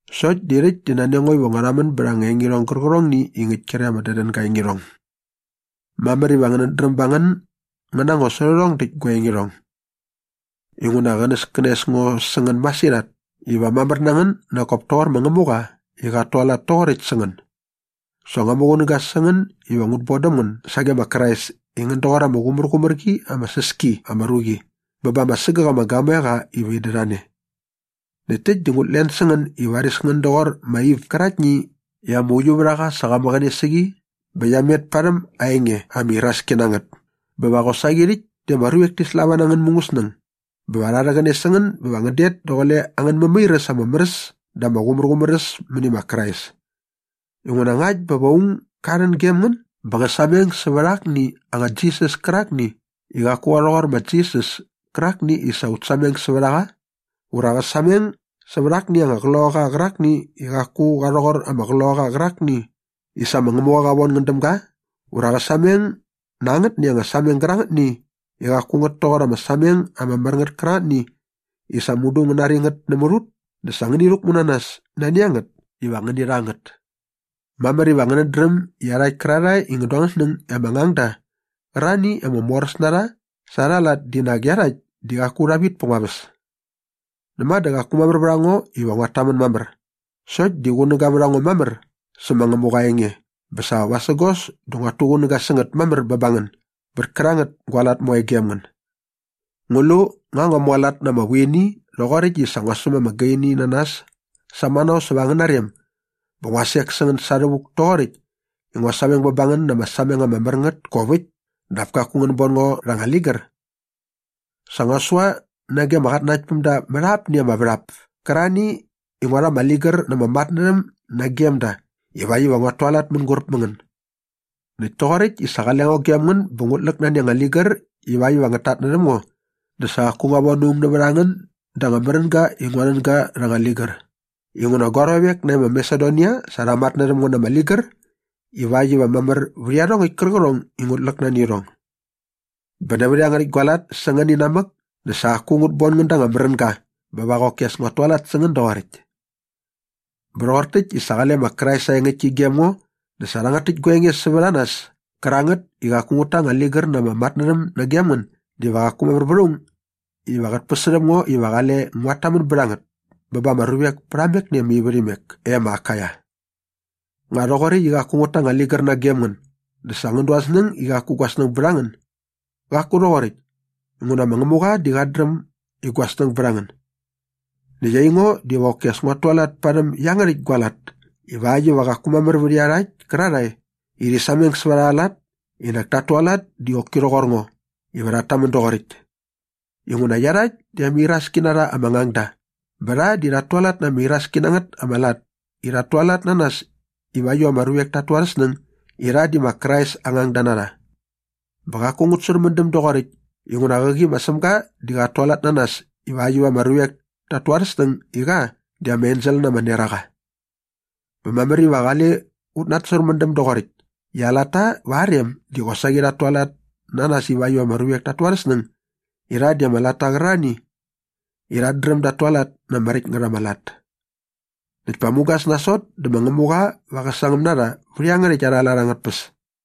Sokt di rhäkt di nani a ngo iva ngua rhamän bät ama engirhong gärqärhongni i ngäkt kre ama dädänga aa engirhong. Mamär iva ngänät dräm ba ngän ngän na ngo sä rhärhong däkt gua engirhong. Inguna qänäskänes ngo sä ngän masirhat iva mamär na ngän nak kop toqor ma Ngämuqa i qat tualat toqoräkt sä ngän. Sa ngua muqunäga sä ngän iva ngut bon däm ngän sage ma Krais i ngän doqor ama qumärqumär qi ama säs ki ama ruqi bä ba ama sägäk ama gamoeqa iva in dät a ne. Näkt täkt di ngut len sä ngän i varis ngän doqor ma Iv käraktni i ama uiuvärhaqa sa qa mäqäne sä qi bä qia met parhäm aa enge ama iraski na ngät bä va qosaqi rhäkt di ama ruvek ti slava na angän mungäsnäng bä va rha rhäqäne sä ngän bä va ngän det daqule angän mämairäs ama mär äs dä ama qumärqumär äs mäni ma Krais. Inguna ngakt bä va aung ga rhän gem ngän bä qä sameng sävät akni anga Jisas kärakni i qaku qa rhoqor ma Jisas kärakni i sa ut sameng sävät a qa ura qä sameng sävät akni anga qloqaqa qärakni i qaku qa rhoqor ama Qloqaqa qärakni i sa ma Ngämuqa qa von ngän däm ga ura qä sameng na angätni anga sameng gärangätni i qaku ngät toqor ama sameng ama mär ngät kärangätni i sa mudu ngän nari ngät nämät ut dä sa ngäni rhäkmu na nas nani a ngät iva ngäni rha ngät. Mamär iva ngänät dräm i iarhakt kärarhae i ngän du angän snäng i ama ngangda qärarhani i ama moräs na rha sa arha lat di nak iarhakt di qaku rha vit pät ngua väs. Näma dä qaku mamär vät a ngo iva nguat tamän mamär sokt di qunäga vät a ngo mamär sä ma Ngämuqa aa enge bä sa vasägos dä nguat tuqunäga sä ngät mamär bä ba ngän bät kärangät gua lat moe gem ngän. Ngu lu nga ngua mualat na ama vuini rhoqoräkt i sa ngua säm ama gaini na nas samanao säva angäna rem bä ngua sek sä ngän sa rhävuk toqoräkt i ngua sameng bä ba ngän na ama sameng ama mär ngät kop äkt dap kaku ngän bon ngo rha anga ligär? Sa ngua sua nage ama qatnanaktpämda mät apni ama värhap kärarhani i ngua rha ama ligär na ama matnärhäm nagem da ivakt iva nguat tualat mänguräp mä ngän. Näkt toqoräkt i sa qale ngo gem ngän bä ngut läk nani anga ligär ivakt iva ngät tatnärhäm ngo dä sa qaku ngua von aung nävät a ngän da anga märänga i ngua nän ga rha anga ligär inguna gua ruavek nae ma Masedonia sa rha matnärhäm ngo na ama ligär ivakt iva mamär vät iarhongäkt kärqärhong i ngut läk nani irhong. Bä nävät iangärhäkt gua lat sä ngän inamäk dä sa qaku ngut bon ngän da anga märänga bä va qoki as pa nguat tualat sä ngän doqoräkt. Bä rhoqor täkt i sa qale ma Krais aa engäktki gem ngo dä sa rhangät täkt gua enge sävät a nas kärangät i qaku ngut ta anga ligär na ama matnärhäm nagem ngän diva qaku mamär vät aung iva qät päsärhäm ngo iva qale nguat tamän bät a ngät bä ba ama ruvek pät ama ivärhimek e ma Akaia. Nga rhoqoräkt i qaku ngut ta anga ligär nagem ngän dä sa ngän du angän snäng i qaku gua snäng bät a ngän? Qaku rhoqoräkt inguna ma Ngämuqa di qat dräm i gua snäng bät a ngän. Näkt aingo diva qoki as nguat tualat parhäm iangärhäkt gua lat ivakt iva qaku mamär vät iarhakt kärarhae i rhi sameng sävät arha lat i nak tat tualat di qoki rhoqor ngo iva rhat tamän doqoräkt. Inguna iarhakt di ama iraski na rha ama ngangda bä rha di rhat tualat na ama iraski na ngät ama lat i rhat tualat na nas ivakt iva ama ruvek tat tu arhä snäng i rha di ma Krais aa ngangda na rha. Bä qaku ngut särmändäm doqoräkt inguna qäqi ma Sämga di sa qat tualat na nas ivakt iva ama ruvek tat tu arhä snäng i qa di ama ensel na ama neraqa. Bä mamär iva qale ut natsärmändäm doqoräkt i aa latta va aa rem di qosaqi rhat tualat na nas ivakt iva ama ruvek tat tu arhä snäng i rha di ama latta qärarhani i rhat dräm dat tualat na ama räkt ngät ama lat. Näkt pa mugas nasot dä ma Ngämuqa va qä sangäm na rha vät iangärhäkt arha lat angät tpäs.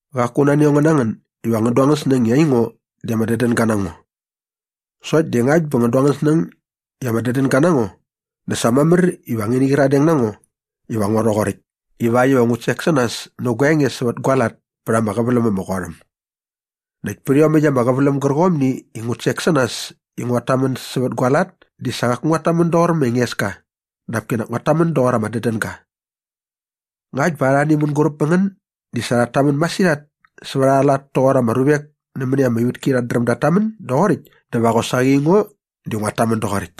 Qaku nani a ngo na ngän iva ngän du angän snäng i aingo di ama dädänga na ngo. Sokt di ngakt bä ngän du angän snäng i ama dädänga na ngo dä sa mamär iva ngäni qyiradeng na ngo iva ngo rhoqoräkt ivakt iva ngu sek sä nas nä gua enge sävät gua lat pät ama qäväläm ama qot äm. Näkt pät iomäkt ama qäväläm gärqomni i ngut sek sä nas i nguat tamän sävät gua lat di sa qaku nguat tamän doqor ma Engeska dap kinak nguat tamän doqor ama dädänga. Ngakt bä arhani mänguräp mä ngän di sa rhat tamän masirhat sävät arha lat toqor ama ruvek nämäni ama ivätki rhat dräm dat tamän doqoräkt dä va qosaqi aingo diva nguat tamän doqoräkt.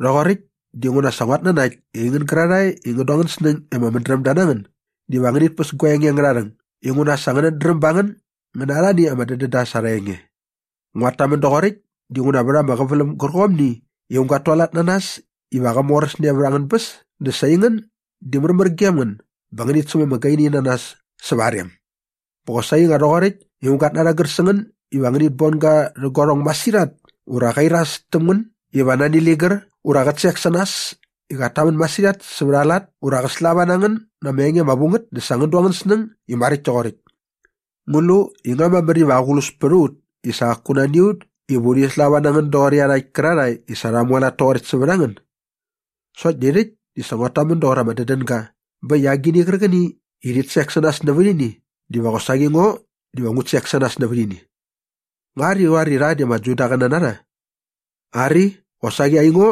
Rhoqoräkt dinguna sa nguat nanakt i aingän gärarhae i ngän du angän snäng i ama mädrämda na ngän diva ngänit päs gua enge angärha rhäng inguna sa ngänät dräm ba ngän ngän na arhani ama dädända sa arha enge. Nguat tamän doqoräkt dinguna vät ama qäväläm gärqomni i aung gat tualat na nas iva qä moräsne vät angän bäs dä sa aingän di märmär gem ngän bä ngänit säm ama gaini na nas säva aa rem. Bä qosaqi nga rhoqoräkt i aung gat narhägär sä ngän iva ngänit bon ga rhä guarhong masirhat ura qä iras täm ngän iva nani ligär ura qät sek sä nas i qat tamän masirhat sävät aa lat ura qä slava na ngän na ama enge ama vu ngät dä sa ngän du angän snäng i maräkt toqoräkt. Ngu lu i nga mamär iva aqlus pät a ut i sa qaku nani a ut iva urhi slava na ngän doqor iarhakt kärarhae i sa rha mualat toqoräkt sävät a ngän? Sokt di rhäkt di sa nguat tamän doqor ama dädänga bä äkt i agini qärqäni i rhit sek sä nas nävät ini diva qosaqi ngo diva ngut sek sä nas nävät ini. Nga rhi qoar i rha di ama Judaqäna na rha? Ari, qosaqi aingo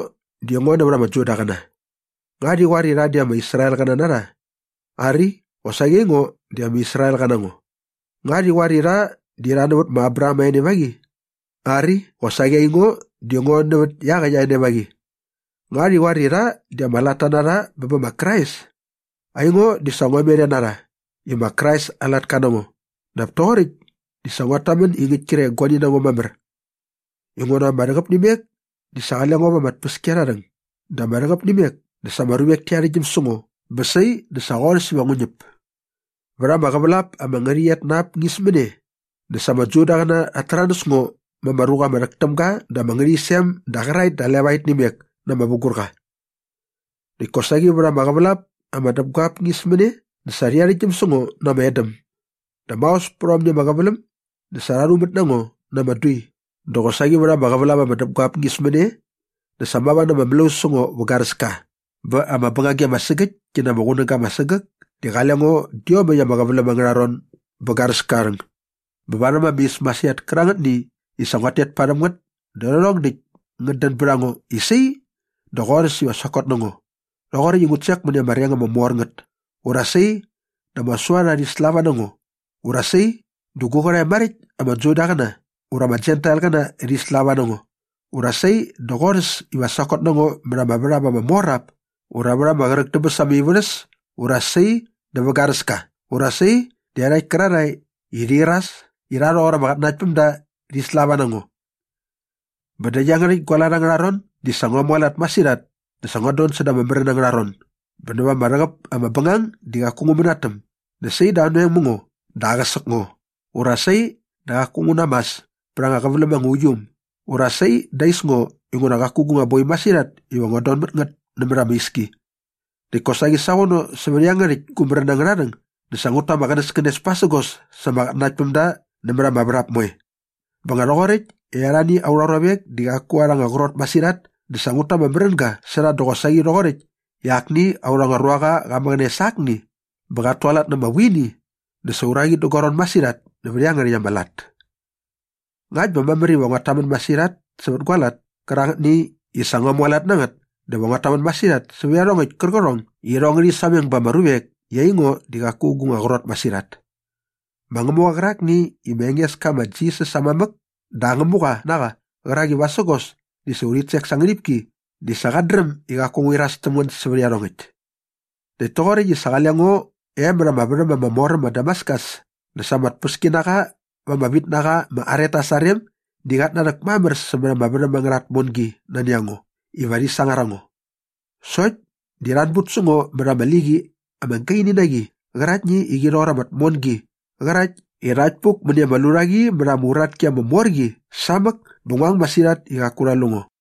di ngo nävät ama Judaqäna. Nga rhi qoar i rha di ama Israelqäna na rha? Ari, qosaqi aingo di ama Israelqa na ngo. Nga rhi qoar i rha di rha nävät ma Abraham aa enevaqi? Ari, qosaqi aingo di ngo nävät iaqäkt aa enevaqi. Nga rhi qoar i rha di ama latta na rha bä bä ma Krais? Aingo di sa ngua met e na rha i ma Krais aa latka na ngo dap toqoräkt di sa nguat tamän i ngäkt kre i guani na ngo mamär. Inguna ma ama rhäqäp nä imek dä sa qale ngo va ama tpäskiarharhäng dä ma ama rhäqäp nä imek dä sa ama ruvek ti arhäktgyäm sä ngo bä sai dä sa qorhäs iva ngu ñäp. Vät ama qävälap ama ngärhäqyet na ap ñismäne dä sa ama Judaqäna rhat täranäs ngo ma ama ruqa ama rhäk täm ga da ama ngärhäqyisem da qäraet da levaet nä imek na ama vugurqa. Näkt kosaqi vät ama qävälap ama däpguap ñismäne dä sa rha arhäktgyäm sä ngo na ama edäm. Dä maos pät aomni ama qäväläm dä sa rha rhumät na ngo na ama dui dä qosaqi vät ama qävälap ama däpguap ñismäne dä sa mava na ama mlaus sä ngo vä garäska bä ama bängagi ama sägäkt ki na ama qunäga ama sägäk di sa qale ngo dä iomäkt ama qäväläm angärha ron bät garäska aa rhäng. Bä varhäm ama is masirhat kärangätni i sa nguat tet parhäm ngät dä rhärhong därhäkt ngät dän bät a ngo i sai dä qorhäs iva sokot na ngo rhoqoräkt i ngut sek mäni ama reng ama mor ngät ura sai dä ama suarha rhi slava na ngo ura sai dä gu qärhae maräkt ama Judaqäna ura ama Jentailqäna rhi slava na ngo ura sai dä qorhäs iva sokot na ngo mät ama värhap ama mor ap ura vät ama qräk dä bäs ama ivärhäs ura sai dä vä garäska ura sai dä iarhakt kärarhae i rhi iras i rha rhoqor ama qatnanaktpämda rhi slava na ngo. Bä dä iangärhäkt gua lat ängärha ron di sa ngua mualat masirhat dä sa nguat don säda ama märän angärha ron bä näva ama rhäqäp ama bängang di qaku ngu mänatäm dä sai dä anoeng mä ngo dä aqäsäk ngo ura sai di qaku ngu namäs pät ama qäväläm ama uiu äm ura sai di ais ngo inguna qaku gu nga boi masirhat iva nguat don mät ngät nämät ama iski. Näkt kosaqi savono sävät iangärhäkt gu märän angärha rhäng dä sa ngut ta ama qänäskänes pasägos sa ama qatnanaktpämda nämät ama värhap moe. Bä nga rhoqoräkt i arhani aurha ruavek di qaku arha anga qrot masirhat dä sa ngut ta ama märänga sä rha dä qosaqi rhoqoräkt i akni aurha ruaqa qa mäqäne sä akni bä qat tualat na ama vuini dä sa uraqi dä gua ron masirhat nävät iangärhäkt ama lat. Ngakt bä mamär iva nguat tamän masirhat sävät gua lat kärangätni i sa ngua mualat na ngät dä va nguat tamän masirhat sävät iarhongäkt kärqärhong i irhong ngärhi sameng ba ama ruvek i aingo di qaku gu nga qrot masirhat. Ma Ngämuqa qärakni i ma Engeska ma Jisas aa mamäk dä aa Ngämuqa na qa qärak i vasägos dä sa urhit sek sa aa ngärhipki di sa qat dräm i qaku ngu iras täm ngän sävät iarhongäkt. Näkt toqoräkt i sa qale ngo e mät ama värhäm ama mor äm ma Damaskus dä sa ama tpäskinaqa va ama vitnaqa ma Aretas aa rem di qat narhäk mamär sämät ama värhäm angärha tmon nani a ngo iva rhi sangar a ngo. Sokt di rha anbut sä ngo mät ama liqi ama gaini na qi qäraktni i qi rhoqor ama tmongi qärakt i rhakt puk mäni ama lurhaqi mät ama uratki ama mor qi samäk bä ngua ang masirhat i qaku rha lu ngo.